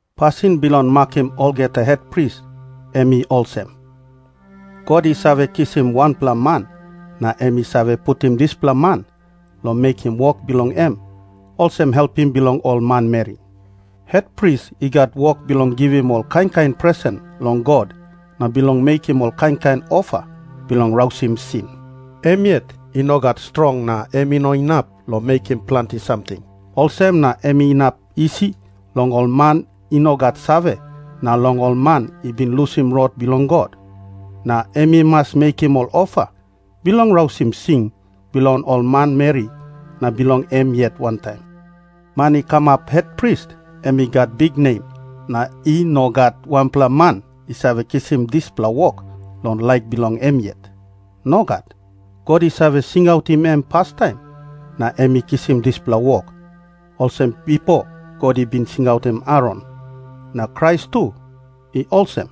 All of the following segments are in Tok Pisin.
Pasin bilong makim olgeta hetpris em i olsem. God i save kisim wanpela man na em i save putim dispela man long mekim wok bilong em olsem helpim bilong ol manmeri. Hetpris i gat wok bilong givim ol kain kain presen long God na bilong mekim ol kain kain ofa bilong rausim sin. Em yet i no gat strong na em i no inap long mekim planti samting. Olsem na em inap isi long ol man i no gat save na long ol man i bin lusim rot bilong God. Na em i mas mekim ol ofa bilong rausim sin bilong ol manmeri na bilong em yet wantaim. Man i kamap hetpris, em i gat biknem, na i no gat wanpela man i save kisim dispela wok long laik bilong em yet. Nogat. God i save singautim em pastaim na em i kisim dispela wok, olsem bipo God i bin singautim Aron. Na Krais tu i olsem.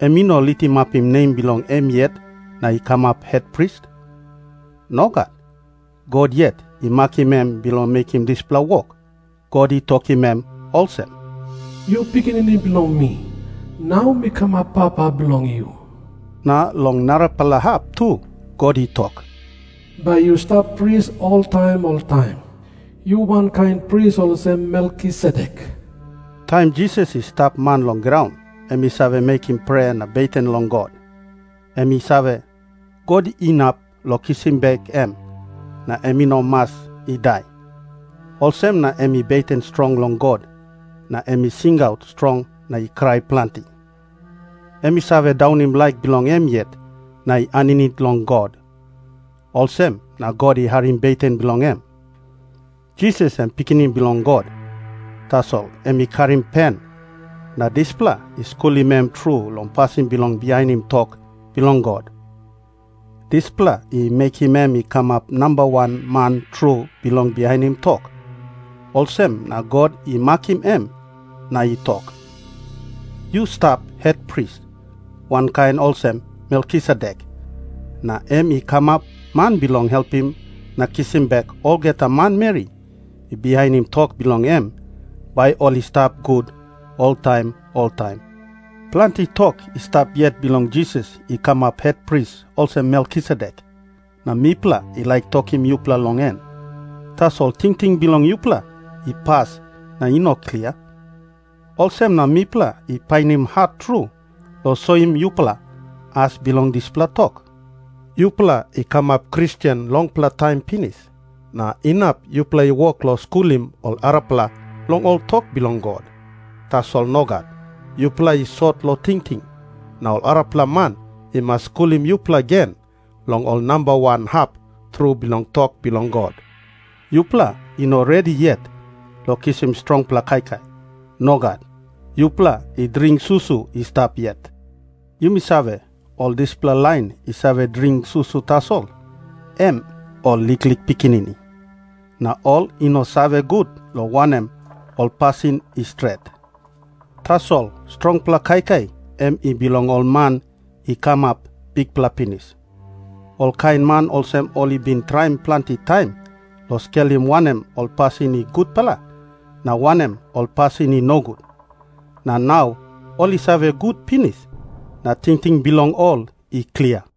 Em i no litimapim nem bilong em yet na i kamap hetpris. Nogat. God yet i makim em bilong mekim dispela wok. God i tokim em olsem, “Yu Pikinini bilong mi. Nau mi kamap papa bilong yu.” Na long narapela hap tu God i tok, “Bai yu stap pris oltaim oltaim. Yu wankain pris olsem Melkisedek.” Taim Jisas i stap man long graun, em i save mekim prea na beten long God. Em i save, God inap long kisim bek em, na em i no mas i dai, olsem na em i beten strong long God, na em i singaut strong na i krai planti. Em i save daunim laik bilong em yet na i aninit long God, olsem na God i harim beten bilong em. Jisas em i Pikinini Bilong God, tasol em i karim pen, na dispela i skulim em tru long pasin bilong bihainim tok bilong God. Dispela i mekim em i kamap nambawan man tru bilong bihainim tok. Olsem na God i makim em na i tok, “Yu stap hetpris, wankain olsem Melkisedek,” na em i kamap Man bilong helpim na kisim bek olgeta manmeri i bihainim tok bilong em, bai ol i stap gut oltaim oltaim. Planti tok i stap yet bilong Jisas i kamap hetpris olsem Melkisedek, na mipela i laik tokim yupela long en. Tasol tingting bilong yupela i pas na i no klia. Olsem na mipela i painim hat tru long soim yupela as bilong dispela tok. Yupela i kamap Kristen longpela taim pinis, na inap yupela i wok long skulim ol arapela long ol tok bilong God. Tasol nogat. Yupela i sot long tingting, na ol arapela man i mas skulim yupela gen long ol namba wan hap tru bilong tok bilong God. Yupela i no redi yet long kisim strongpela kaikai. Nogat. Yupela i dring susu i stap yet. Yumi save, ol dispela lain i save dring susu tasol, em ol liklik pikinini. Na ol i no save gut long wanem ol pasin i stret. Tasol strongpela kaikai em i bilong ol man i kamap bikpela pinis. Ol kain man olsem ol i bin traim planti taim long skelim wanem ol pasin i gutpela na wanem ol pasin i nogut, na nau ol i save gut pinis na tingting bilong ol i klia.